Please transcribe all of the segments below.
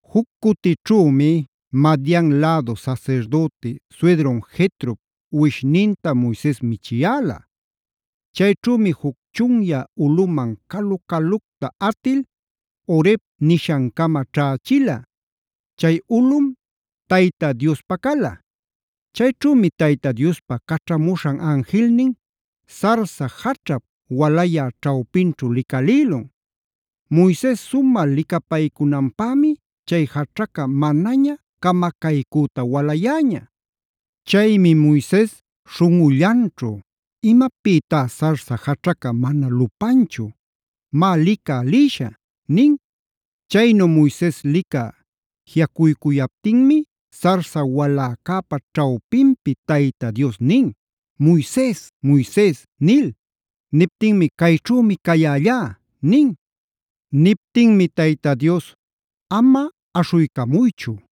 Juc cutićhümi Madian lädu sasirdüti suydrun Jetrop uwishninta Moises michiyäla. Chayćhümi juc chunyä ulꞌuman calu-calucta atil Horeb nishan-cama ćhächila. Chay ulꞌum Tayta Diospa cala. Chayćhümi Tayta Diospa caćhamuśhan anjilnin sarsa jaćhap walayä ćhawpinćhu licalïlun. Moises sumä licapaycunanpämi chay jaćhaca manaña camacaycüta walayäña. Chaymi Moises śhunꞌullanćhu: “¡Imapïtá sarsa jaćhaca mana lupanchu! Má, licä lïshä” nin. Chaynu Moises licä jiꞌacuycuyaptinmi sarsa waläcäpa ćhawpinpi Tayta Dios nin: “¡Moises, Moises!” nil. Niptinmi: “Cayćhümi cayällá” nin. Niptinmi Tayta Dios: “Ama aśhuycamuychu.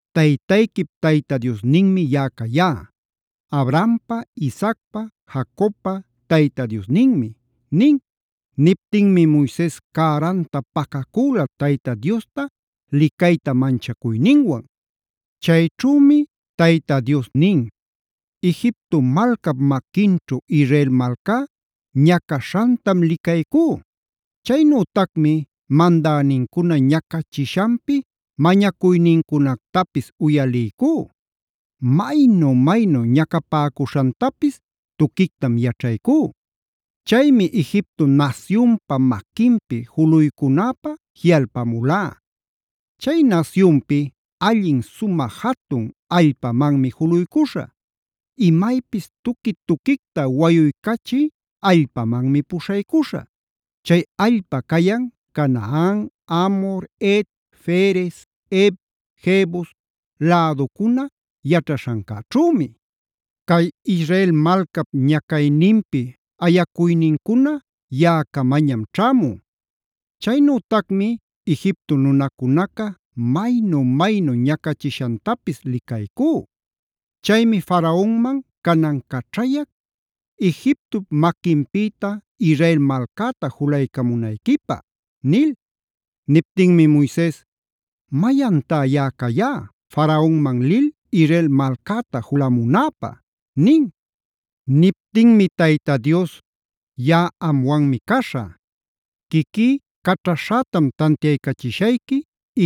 Taytayquip Tayta Diosninmi yaꞌa cayá; Abrahampa, Isaacpa, Jacobpa Tayta Diosninmi” nin. Niptinmi Moises cäranta pacacüla Tayta Diosta licayta manchacuyninwan. Chayćhümi Tayta Dios nin: “Egipto malcap maquinćhu Israel malcá ñacaśhantam licaycú. Chaynütacmi mandänincuna ñacachishanpi mañacuynincunactapis uyaliycú. Maynu-maynu ñacapäcuśhantapis tuquictam yaćhaycú. Chaymi Egipto nasyunpa maquinpi juluycunäpä jiꞌalpamulá. Chay nasyunpi allin sumä jatun allpamanmi juluycuśhä; imaypis tuqui-tuquicta wayuycachï allpamanmi puśhaycuśhä. Chay allpa cayan Canaan, Amhor, Het, Ferez, Hev, Jebus läducuna yaćhaśhancäćhümi. Cay Israel malcap ñacayninpi ayacuynincuna yaꞌacamañam ćhämun. Chaynütacmi Egipto nunacunaca maynu-maynu ñacachishantapis licaycú. Chaymi Faraonman canan caćhayac Egiptop maquinpïta Israel malcäta julaycamunayquipä” nil.b Niptinmi Moises: “¿Mayantá yaꞌa cayá Faraonman lil Israel malcäta julamunäpä?” nin. Niptinmi Tayta Dios: “Yaꞌa amwanmi caśhä. Quiquí caćhaśhätam tantiachishayqui,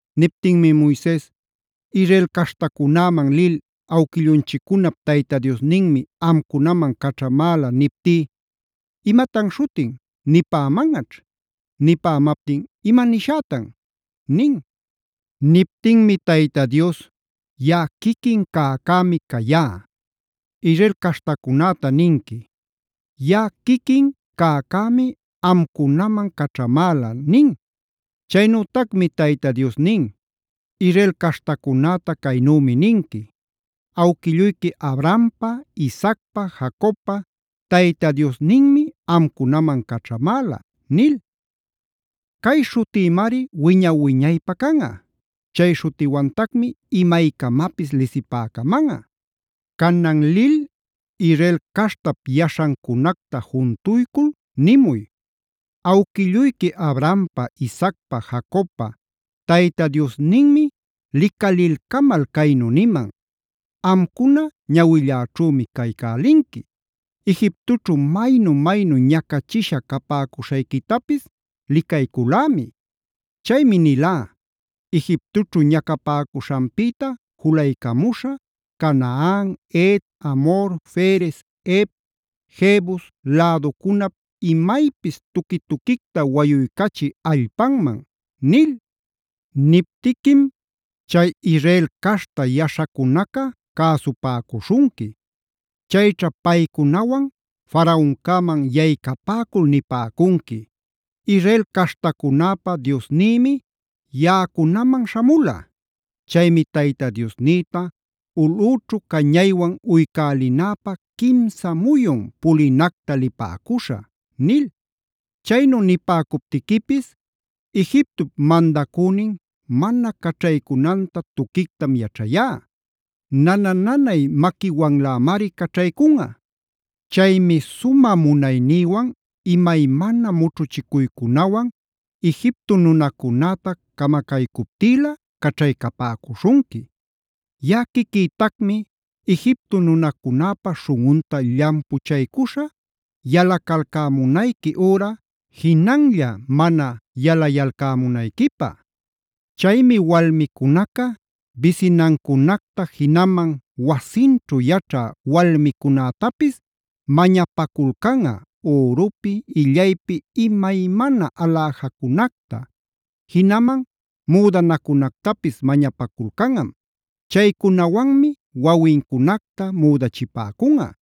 Niptinmi Moises: “Israel caśhtacunäman lil awquillunchiccunapd Tayta Diosninmi amcunaman caćhamäla niptí ‘¿imatan śhutin?’ nipämanꞌaćh. Nipämaptin ¿ima nishätan?” nin. Niptinmi Tayta Dios: “YAꞌA QUIQUIN CÄCÄMI cayá.e Israel caśhtacunäta ninqui: ‘YAꞌA QUIQUIN CÄCÄMI’ amcunaman caćhamäla” nin. Chaynütacmi Tayta Dios nin: “Israel caśhtacunäta caynümi ninqui: ‘Awquilluyqui Abrahampa, Isaacpa, Jacobpa Tayta Diosninmif amcunaman caćhamäla’ nil. Cay śhutïmari wiña-wiñaypä canꞌa. Chay śhutiwantacmi imaycamapis lisipäcamanꞌa. Canan lil Israel caśhtap yaśhancunacta juntuycul nimuy: Awquilluyqui Abrahampa, Isaacpa, Jacobpa Tayta Diosninmi licalilcamal caynu niman: ‘Amcuna ñawilläćhümi caycälinqui. Egiptoćhu maynu-maynu ñacachisha capäcuśhayquitapis licayculämi. Chaymi nilá Egiptoćhu ñacapäcuśhanpïta juluycamuśhä Canaan, Het, Amhor, Ferez, Hev, Jebus läducunap imaypis tuqui-tuquicta wayuycachï allpanman’ nil. Niptiquim chay Israel caśhta yaśhacunaca cäsupäcuśhunqui. Chayćha paycunawan Faraoncäman yaycapäcul nipäcunqui: ‘Israel caśhtacunäpa Diosnïmi yaꞌacunaman śhamula. Chaymi Tayta Diosnïta ulꞌüchu cañaywan uycälinäpä quimsa muyun pulinacta lipäcuśhä’ nil. “Chaynu nipäcuptiquipis Egiptop mandacünin mana caćhaycunanta tuquictam yaćhayá. Nana-nanay maquiwanlämari caćhaycunꞌa. Chaymi sumä munaynïwan imaymana mućhuchicuycunawan Egipto nunacunäta camacaycuptïlä caćhaycapäcuśhunqui. Yaꞌa quiquïtacmi Egipto nunacunäpa śhunꞌunta llampuchaycuśhä yalacalcämunayqui üra jinanlla mana yalayalcämunayquipä. Chaymi walmicunaca bisinancunacta jinaman wasinćhu yaćhä walmicunätapis mañapaculcanꞌa ürupi, illaypi imaymana aläjacunacta; jinaman müdanacunactapis mañapaculcanꞌam. Chaycunawanmi wawincunacta müdachipäcunꞌa.